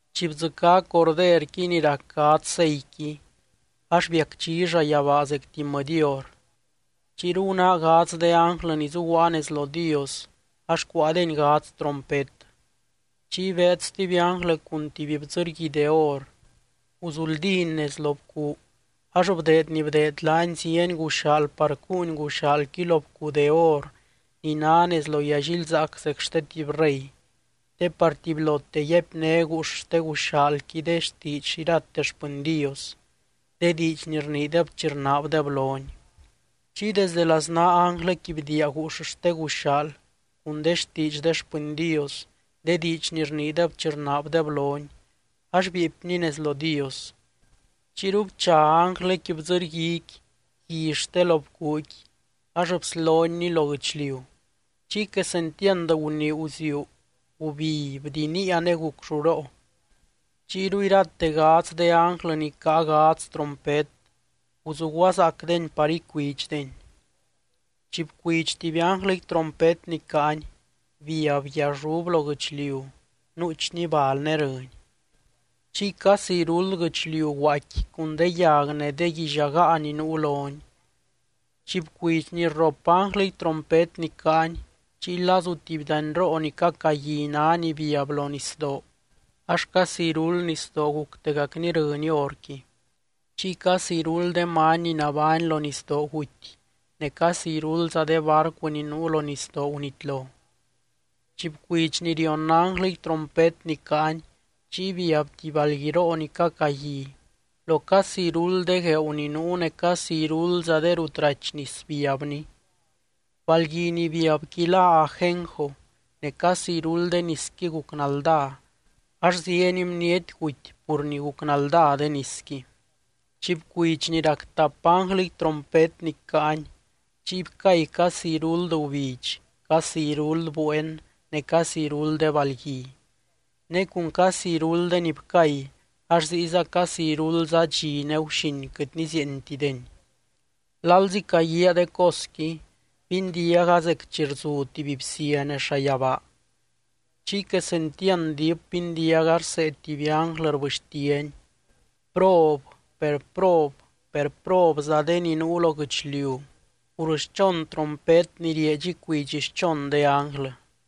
Chi bdzɨcá Corderqui ni rac gadz seiqui, ax biacdxi llayabaa zecti mɨdy hor. Chiyru gunáa gadz de ánglɨ ni zuguaa nez lo Dios, ax cuáadeny gadz trompet. Chiy beed stuby ánglɨ cun tuby bdzɨrgui de or, guzuldíny nez lo bcuu ax bdeed ni bdeed laany zieny guxaal par cuuny guxaalqui lo bcuu de or ni ná nez lo yallilzaac zec xte tuby rey, te par tubylote yaipné guux xte guxaalqui de xtiidx irate xpɨny Dios, de diidx ni rniideb chi rnaabdeb lony. Chiy desde laznaa ánglɨqui bdiia guux xte guxaal cun de xtiidx de xpɨny Dios, de diidx ni rniideb chi rnaabdeb lony, ax bieepni nez lo Dios. Chiyru bcha ánglɨqui bdzɨrguiqui gui xte lo bcuuqui ax bslonyni lo guɨchliu. Chiy quesentiand gunii guziuu, gubi, bdiniia ne guc lluroo. Chiyru irate gadz de ánglɨ ni caa gadz trompet, guzuguazaacdeny par icuidxdeny. Chi bcuidx tuby ánglɨqui trompet ni caany, biab guiallub lo guɨchliu nuuchni bal ne rɨny. Chiy casi iruld guɨchliu guaaicqui cun de yag ne de guillagaa ni nuu loni. Chi bcuidx ni rrop ánglɨqui trompet ni caany, chiy lazu tuby danyroo ni cacagui ná ni biab lo nisdoo, ax casi iruld nisdoo guctegacni rɨny horqui. Chiy casi iruld de many ni nabány lo nisdoo guty ne casi iruldza de barcu ni nuu lo nisdoo gunitlo. Chi bcuidx ni rion ánglɨqui trompet ni caany, chiy biab tuby balguiroo ni cacagui, lo casi iruld de gueeu ni nuu ne casi iruldza de rut rachy nis biabni. Balgui ni biabqui lá “Ajenjo” ne casi iruld de nisqui guc naldá ax zieny bniety guty pur ni guc naldá de nisqui. Chi bcuidx ni rac tap ánglɨqui trompet ni caany, chiy bcay casi iruld gubidx, casi iruld bueen ne casi iruld de balgui. Ne cun casi irulddeni bcay ax ziyza casi iruldza dxi ne guxin quɨt nizieentideni. Lalzi caguíaa de cosqui, bindiaga zec chi rzu tuby bsia nez llayabaa. Chiy quesentiand diip bindiaga rsee tuby ánglɨ rbɨxtiany: —¡Prob, per prob, per probza de ni nuu lo guɨchliu pur xchon trompet ni rieedx icuidx xchon de ánglɨ!